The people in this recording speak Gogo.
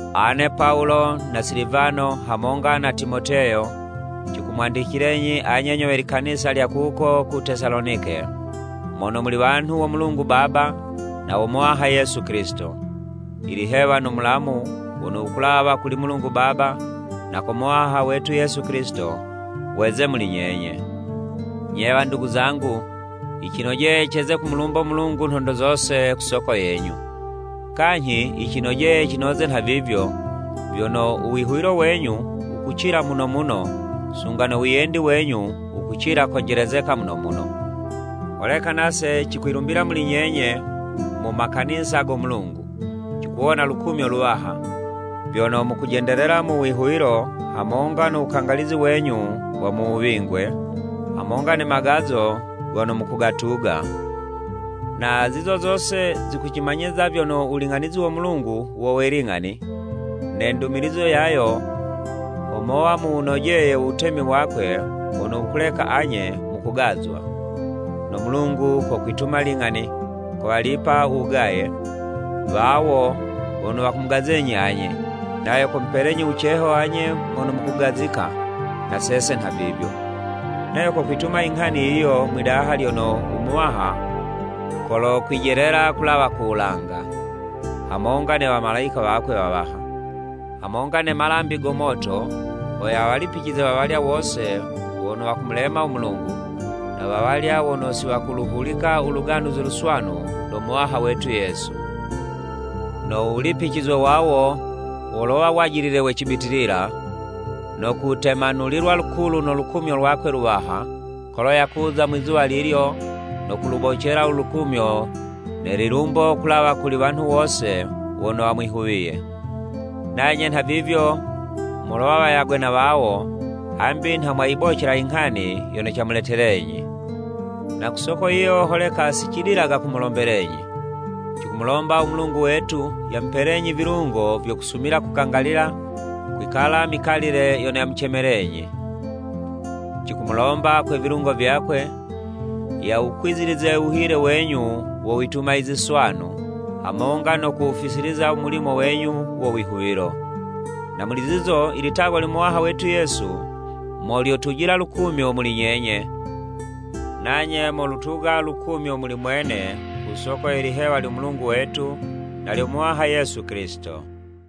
Ane Pawulo na Silivano hamonga na Timoteyo, cikumwandicilenyi anye nyo we likanisa lya kuko ku Tesalonike, mono muli wanhu wo Mulungu Baba na wo Muwaha Yesu Kilisito. Ilihewa no Mulamu wono wukulawa kuli Mulungu Baba na ko Muwaha wetu Yesu Kilisito, weze muli nyenye. Nye wandugu zangu, yicinojeye ceze kumulumbo Mulungu nhondo zose ku soko yenyu. Kanyhi yicinojeye cinoze nhavivyo, vyono u wihuwilo wenyu wukucila muno muno, sunga no wiyendi wenyu wukucila konjelezeka muno muno. Holeka nase cikwilumbila muli nyenye mu makanisa go Mulungu, cikuwona lukumyo luwaha, vyono mukujendelela mu wihuwilo hamonga no wukangalizi wenyu wa mu wuwingwe, hamonga ne magazo gono mukugatuga. Na zizo zose, zikucimanyiza vyono u wuling'anizi wo Mulungu wo we ling'ani, ne ndumilizo yayo ho mowa muwunojeye u Wutemi wakwe wono wukuleka anye mukugazwa. No Mulungu kokwituma ling'ani; kowalipa u wugaye, wawo wono wukumugazenyi anye, nayo komupelenyi wuceho anye mono mukugazika, na sese nhavivyo. Nayo kokwituma i nghani yiyo mwidaha lyono u Muwaha kolokwijelela kulawa ku wulanga, hamonga ne wamalayika wakwe wawaha, hamonga ne malambi go moto, ho yawalipicize wawalya wose wono wakumulema u Mulungu, na wawalya wono si wakuluhulika u Luganuzi Luswanu lo Muwaha wetu Yesu. No wulipicizwe wawo, wolowa wajilile we cibitilila, no kutemanulilwa lukulu no lukumyo lwakwe luwaha, kolo yakuza mwizuwa lilyo no kulubocela u lukumyo ne lilumbo kulawa kuli wanhu wose wono wamwihuwiye. Nanye nhavivyo, molowa wayagwe na wawo, hambi nha mwayibocela i nghani yono camuletelenyi. Na ku soko yiyo, holeka si cidilaga kumulombelenyi. Cikumulomba u Mulungu wetu yamupelenyi vilungo vyo kusumila kukangalila kwikala mikalile yono yamucemelenyi. Cikumulomba, kwe vilungo vyakwe, yawukwizilize u wuhile wenyu wo wituma i ziswanu, hamonga no kuwufisiliza u mulimo wenyu wo wihuwilo. Na muli zizo, i litagwa lyo Muwaha wetu Yesu mo lyotujila lukumyo muli nyenye, nanye mowutuga lukumyo muli mwene ku soko ye lihewa lyo Mulungu wetu na lyo Muwaha Yesu Kilisito.